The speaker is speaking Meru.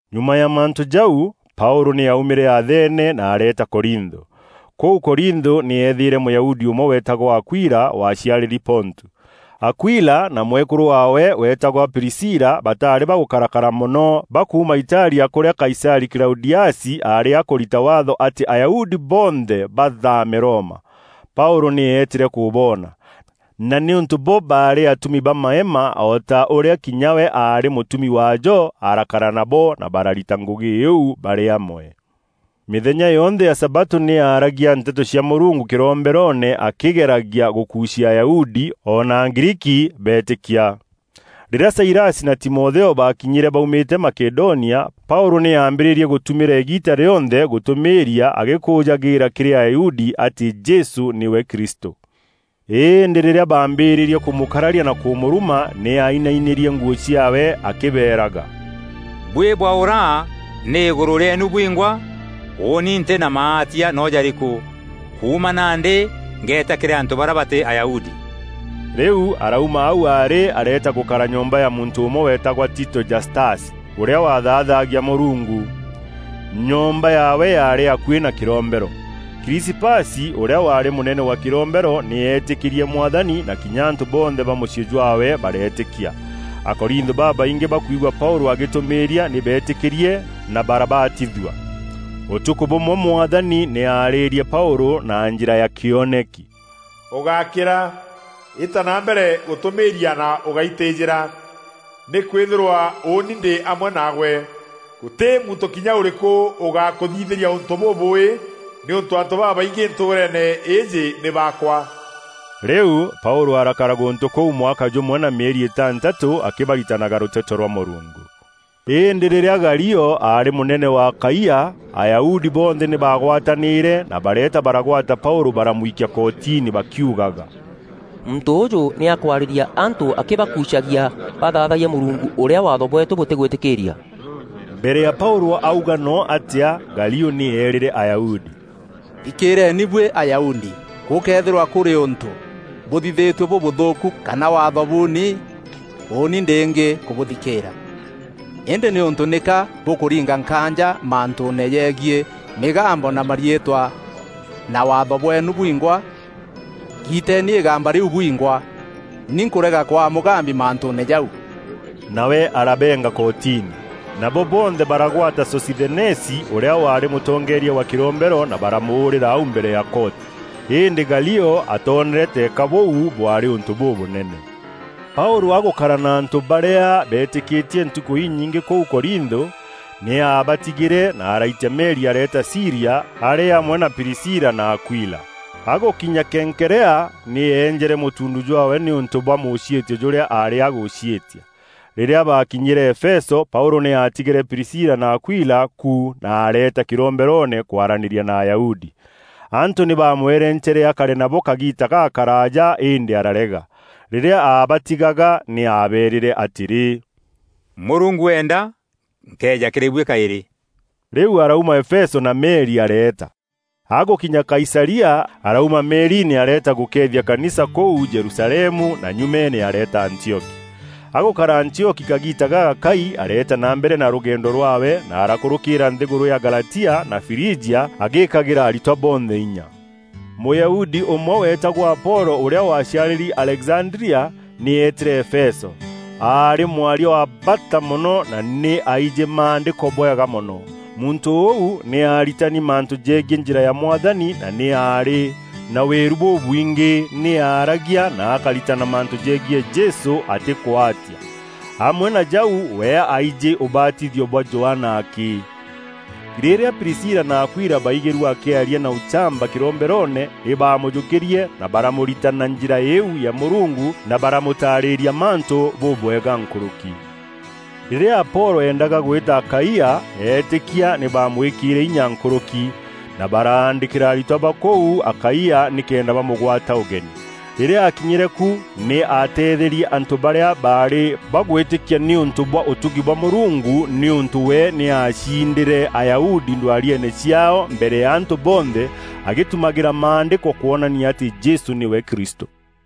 Nyuma ya mantû jau, Paûlû nî aaumîre Athene na areeta Korintho. Kûu Korintho nî eethîîre Mûyahudi ûmwe weetagwa Akuila, waciarîri Pontu. Akuila na mwekûrû waawe weetagwa Prisila, bataarî bagûkarakara mono bakuuma Italia kûrîa Kaisarî Klaudiasi aarî akûrita waatho atî Ayahudi bonthe bathaame Roma. Paûlû nî eetîre kûboona, na nîûntû bo baarî atumi ba maema o ta ûrîa kinya we aarî mûtumi waajo, arakara nabo na bararita ngûgî iu barî amwe. Mîthenya yonthe ya sabatû nî aaragia nteto cia Mûrungu kîromberoone akîgeragia gûkuucia Ayahudi o na Agriiki beetîkia. Rîrîa Sailasi na Timotheo baakinyîre baumîte Makedonia, Paûlû nî aambîrîrie gûtumîra îgiita rîonthe gûtûmîîria, agîkûûjagîîra kîrî Ayahudi atî Jesû nîwe Kristû. Îndî rîrîa baambîrîrie kûmûkararia na kûmûruma, nî ainainîrie nguû ciaawe akîbeeraga, “Buî bwaûra nî îgûrû rîeenu bwingwa; ûûni ntî na maatia noo jarîku. Kuuma nandî ngeeta kîrî antû barîa batî Ayahudi.” Rîu arauma au aarî areeta gûkara nyomba ya muntû ûmwe weetagwa Tito Jastasi, ûrîa waathaathagia Mûrungu. Nyomba yaawe yaarî akuî na kîrombero. Krisipasi, ûrîa waarî mûnene wa kîrombero, nî eetîkîrie Mwathani, na kinya antû bonthe ba mûciî jwaawe bareetîkia. Akorintho babaingî bakwigua Paûlû agîtûmîîria nî beetîkîrie na barabatithua. Ûtukû bûmwe, Mwathani nî aarîrie Paûlû na njîra ya kîoneki: “Ûgákîra! Îta na mbere gûtûmîîria na ûgáitîjîra, nîkwîthîrwa ûûni ndî amwe naagwe. Gûtî muntû kinya ûrîkû ûgakûthithîria ûntû bûbûûî nîûntû antû babaingî ntûûreene îîjî nî baakwa.” Rîu Paûlû arakara gûntû kûu mwaka jûmwe na mîeri îtantatû akîbaritanaga rûteto rwa Mûrungu. Îndî rîrîa Galio aarî mûnene wa Akaia, Ayahudi bonthe nî baagwatanîîre na bareeta baragwata Paûlû baramwikia kotini, bakîugaga, “Muntû ûûjû nî akwarîria antû akîbakuucagia bathaathayia Mûrungu ûrîa Waatho bweetû bûtîgwîtîkîîria.” Mbere ya Paûlû auga noo atîa, Galio nî eerîre Ayahudi, “Thikîîreeni buî Ayahudi! Gûkëethîrwa kûrî ûntû bûthithîtue bûbûthûûku kana Waatho buuni, ûûni ndîngî kûbûthikîîra. Îndî nîûntû nîka bûkûringa nkaanja mantûûne jegiî mîgambo na mariîtwa na Waatho bweenu bwingwa, giiteni îgamba rîu bwingwa. Ni nkûrega kwaa mûgambi mantûûne jau!” Nawe arabeenga kotini. Nabo bonthe baragwata Sosithenesi, ûrîa waarî mûtongeeria wa kîrombero na baramûûrîra au mbere ya koti. Îndî Galio atoonere teeka bûu bwaarî ûntû bûbûnene. Paûlû agûkara na antû barîa beetîkîtie ntukû inyingî kûu Korintho, nî aabatigîre na araitia meri areeta Sîria arî amwe na Prisila na Akuila. Agûkinya Kenkerea nî eenjere mûtuundu jwaawe nîûntû bwa mûciîtio jûrîa aarî agûciîtia. Rîrîa baakinyîre Efeso, Paûlû nî aatigîre Prisila na Akuila ku na areeta kîromberoone kwaranîria na Ayahudi. Antû nî baamwerencere akare nabo kagiita gakaraaja îndî ararega. Rîrîa aabatigaga nî aabeerîre atîrî, “Mûrungu eenda nkeeja kîrî buî kaîrî.” Rîu arauma Efeso na meri areeta. Agûkinya Kaisaria, arauma meeriine areeta gûkeethia kanisa kûu Jerusalemu, na nyumeene areeta Antioki. Agûkara Antioki kagiita gagakai, areeta na mbere na rûgendo rwaawe na arakûrûkîîra nthîgûrû ya Galatia na Frijia agîkagîra aritwa bonthe inya. Mûyahudi ûmwe weetagwa Apolo, ûrîa waciarîri Alexandria, nî eetîre Efeso. Aarî mwaria wa bata mono na nî aijî Maandîko bwega mono. Muntû ûu nî aaritani mantû jegiî njîra ya Mwathani, na nî aarî na wîru bûbwingî nî aaragia na akaritana mantû jegiî Jesû atîkûatia. Amwe na jau we aaijî ûbatithio bwa Johana akî. Rîrîa Prisila na Akuila baigîrue akîaria na ûchamba kîromberoone, nî baamûjûkîrie na baramûritana Njîra îîu ya Mûrungu na baramûtarîria mantû bûbwega nkûrûki. Rîrîa Apolo eendaga gwîta Akaia, eetîkia nî baamwîkîîre inya nkûrûki, na baraandîkîra aritwa ba kûu Akaia nîkenda bamûgwata ûgeni. Rîrîa aakinyîre ku, nî aateetherie antû barîa baarî bagwîtîkia nîûntû bwa ûtugi bwa Mûrungu, nîûntû we nî aacindîre Ayahudi ndwariene ciaao mbere ya antû bonthe agîtumagîra Maandîko kwonania atî Jesû nîwe Kristû.